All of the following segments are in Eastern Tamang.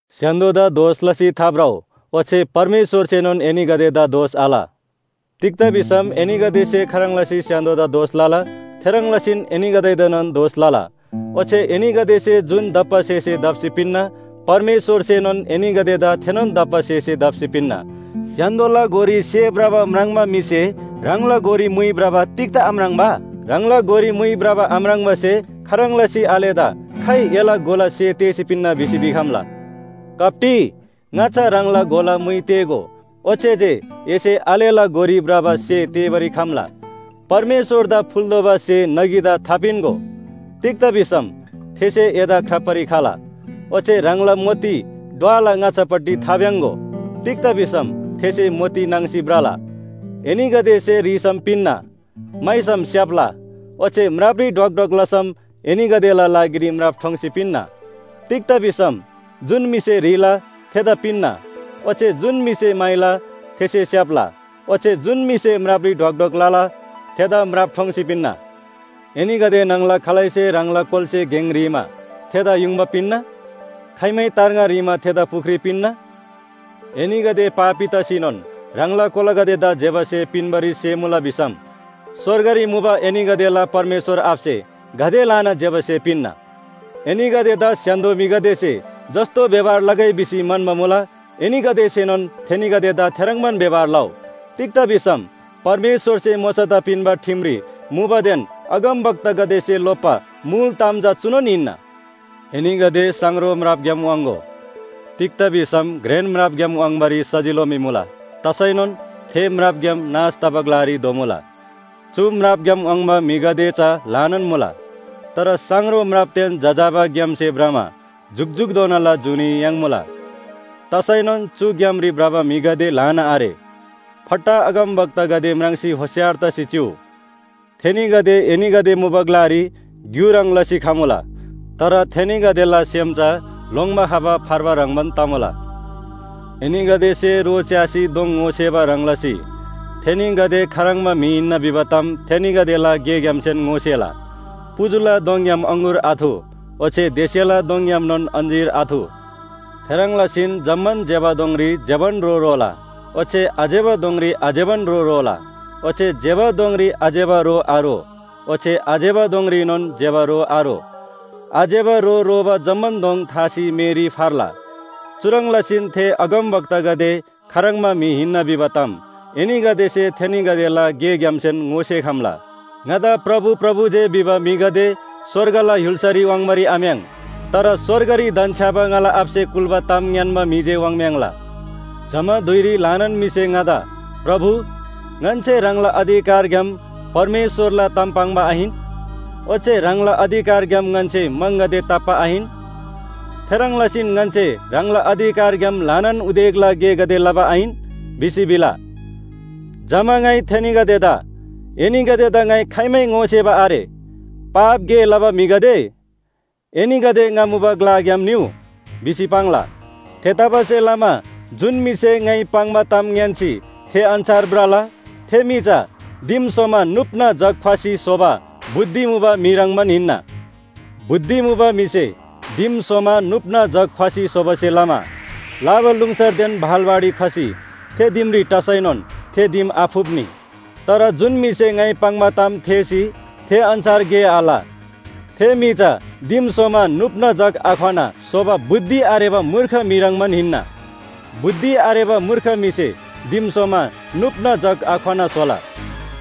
“स्‍य्‍हान्‍दोदा दोष लसी थाभ्रउ ओच्‍छे परमेश्‍वरसेनोन एनीगदेदा दोष आल। तिग्‍दा भिसम एनीगदेसे खाह्रङ् लसी स्‍य्‍हान्‍दोदा दोष लला, थेह्रङ् लसीन एनीगदेदाएनोन दोष लला। ओच्‍छे एनीगदेसे जुन दप्‍बा स्‍हेसे दप्‍सी पिन्‍ना, परमेश्‍वरसेनोन एनीगदेदा थेनोन दप्‍बा स्‍हेसे दप्‍सी पिन्‍ना। “स्‍य्‍हान्‍दोला गोरी सेः भ्रबा म्राङ्बा म्‍हिसे ह्राङला गोरी मुइ भ्रबा तिग्‍दा आम्राङ्बा? ह्राङला गोरी म्‍हुइ भ्रबा आम्राङ्बासे खाह्रङ् लसी आलेदा ‘खाइ एला गोला सेः तेःसी पिन्‍ना भिसी भिखम्‍ला?’ कप्‍टी, ङाच्‍छा ह्राङला गोला मुइ तेःगो, ओच्‍छे जे एसे आलेला गोरी भ्रबा सेः तेःबारी खम्‍ला। “परमेश्‍वरदा फुल्‍तोःबा स्‍हे नगीदा थापिन्‍गो, तिग्‍दा भिसम थेसे एदा ख्राप्‍बारी खला। ओच्‍छे ह्राङला मोती ढ्वला ङाच्‍छापट्टि थाभ्‍याङ्‍‍गो। तिग्‍दा भिसम थेसे मोती नाङ्सी भ्रला। “एनीगदेसे ह्रीसम पिन्‍ना म्‍हाइसम स्‍याप्‍ला ओच्‍छे म्रापरी ढ्वक ढ्वक लसम एनीगदेला लागिरी म्राप ठोङ्सी पिन्‍ना। तिग्‍दा भिसम जुन म्‍हिसे ह्रीला थेदा पिन्‍ना, ओच्‍छे जुन म्‍हिसे म्‍हाइला थेसे स्‍याप्‍ला ओच्‍छे जुन म्‍हिसे म्रापरी ढ्वाक ढ्वाक लला थेदा म्राप ठोङ्सी पिन्‍ना। “एनीगदे न्‍हङला खालैसे ह्राङला कोलासे गेङ ह्रीमा थेदा युङबा पिन्‍ना? खाइमै तार्ङा ह्रीमा थेदा पुख्री पिन्‍ना? एनीगदे पापी तसीनोन ह्राङला कोलागदेदा ज्‍यबा स्‍हे पिन्‍बारी सेमुला भिसम स्‍वर्गरी मुबा एनीगदेला परमेश्‍वर आबासे गाते ल्‍हाना ज्‍यबा स्‍हे पिन्‍ना। एनीगदेदा स्‍य्‍हान्‍दो म्‍हिगदेसे जस्‍तो व्‍यवहार लगै भिसी म्‍हन्‍बा मुला एनीगदेसेनोन थेनीगदेदा थेह्रङ्बान व्‍यवहार लउ। तिग्‍दा भिसम परमेश्‍वरसे मोशादा पिन्‍बा ठिमरी मुबादेन अगमवक्तासे लोप्‍बा मुल ताम चुनोन हिन्‍ना। “एनीगदे साङरो म्रापग्‍याम वाङ्‍गो। तिग्‍दा भिसम घ्रेन म्रापग्‍याम वाङ्बारी सजिलो मी मुला तसैनोन थे म्रापग्‍याम नाश तबा ग्‍लारी धोमुला। चु म्रापग्‍याम वाङ्बा म्‍हिगदे चा ल्‍हानान मुला। तर साङरो म्रापदेन जजाबा ग्‍यामसे भ्रमा जुकजुकधोनाला जुनी याङ्मुला। तसैनोन चु ग्‍यामरी भ्रबा म्‍हिगदे ल्‍हाना आरे। “फट्टा अगमवक्तागदे म्राङ्सी होशियार तसी चिउ, थेनीगदे एनीगदे मुबा ग्‍लारी ग्‍यु ह्रङ् लसी खमुला, तर थेनीगदेला सेम चा लोङ्‌बा खबा फार्बा ह्रङ्‌बान तमुला। एनीगदेसे रो च्‍यासी दोङ ङोसेबा ह्रङ् लसी थेनीगदे खाह्रङ्बा म्‍हि हिन्‍ना भिबा ताम थेनीगदेला गेग्‍यामसेन ङोसेला। पुजुला दोङग्‍याम अङगुर आथु ओच्‍छे देस्‍यला दोङग्‍यामनोन अञ्‍जीर आथु। थेह्रङ् लसीन जम्‍मान ज्‍यबा दोङरी ज्‍यबान रो रोला। ओच्‍छे आज्‍यबा दोङरी आज्‍यबान रो रोला। ओच्‍छे ज्‍यबा दोङरी आज्‍यबा रो आरो ओच्‍छे आज्‍यबा दोङरीनोन ज्‍यबा रो आरो। आज्‍यबा रो रोबा जम्‍मान दोङ थासी मेरी फर्ला। चुह्रङ् लसीन थे अगमवक्तागदे खाह्रङ्बा म्‍हि हिन्‍ना भिबा ताम एनीगदेसे थेनीगदेला गेग्‍यामसेन ङोसेखम्‍ला। “ङादा ‘प्रभु, प्रभु’ जे भिबा म्‍हिगदे स्‍वर्गला य्‍हुल्‍सारी वाङ्बारी आम्‍याङ्। तर स्‍वर्गरी धन्‍छ्‌याबा ङाला आबासे कुल्‍बा ताम ङ्‌यान्‍बा म्‍हि जे वाङ्म्‍याङ्ला। जमा धुइरी ल्‍हानान म्‍हिसे ङादा ‘प्रभु, ङन्‍से ह्राङला अधिकारग्‍याम परमेश्‍वरला ताम पाङ्बा आहिन? ओच्‍छे ह्राङला अधिकारग्‍याम ङन्‍से म्‍हङगदे ताप्‍बा आहिन? थेह्रङ् लसीन ङन्‍से ह्राङला अधिकारग्‍याम ल्‍हानान उदेकला गेगदे लबा आहिन?’ भिसी भिला। जमा ङाइ थेनीगदेदा ‘एनीगदेदा ङाइ खाइमै ङोसेबा आरे। पाप गे लबा म्‍हिगदे, एनीगदे ङा मुबा ग्‍लाग्‍याम निउ’ भिसी पाङ्ला। “थेतबासेलमा जुन म्‍हिसे ङाइ पाङ्बा ताम ङ्‌यान्‍सी थे अन्‍छार भ्रला, थे म्‍हि चा दिम स्‍होमा नुप्‍ना जग ख्‍वसी स्‍होबा बुद्धि मुबा म्‍हि ह्रङ्‌बान हिन्‍ना। बुद्धि मुबा म्‍हिसे दिम स्‍होमा नुप्‍ना जग ख्‍वसी स्‍होबासे लमा लाबालुङसरदेन भाल बाढी खसी थे दिमरी टसैनोन थे दिम आफुप्‍नी। तर जुन म्‍हिसे ङाइ पाङ्बा ताम थेःसी थे अन्‍छार गे आल, थे म्‍हि चा दिम स्‍होमा नुप्‍ना जग आख्‍वना स्‍होबा बुद्धि आरेबा मूर्ख म्‍हि ह्रङ्‌बान हिन्‍ना। बुद्धि आरेबा मूर्ख म्‍हिसे दिम स्‍होमा नुप्‍ना जग आख्‍वना स्‍होला।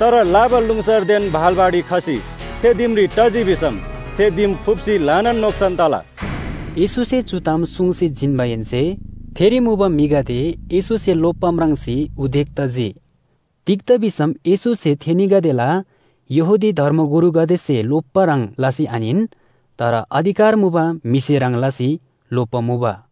तर लाबालुङसरदेन भाल बाढी खसी थे दिमरी टजी भिसम थे दिम फुप्‍सी ल्‍हानान नोक्‍सान तला।” येशूसे चु ताम सुङ्सी जिन्‍माहेन्‍से थेरी मुबा म्‍हिगदे येशूसे लोप्‍बा म्राङ्सी उदेक तजी। तिग्‍दा भिसम येशूसे थेनीगदेला यहूदी धर्मगुरुगदेसे लोप्‍बा ह्रङ् लसी आहिन, तर अधिकार मुबा म्‍हिसे ह्रङ् लसी लोप्‍बा मुबा।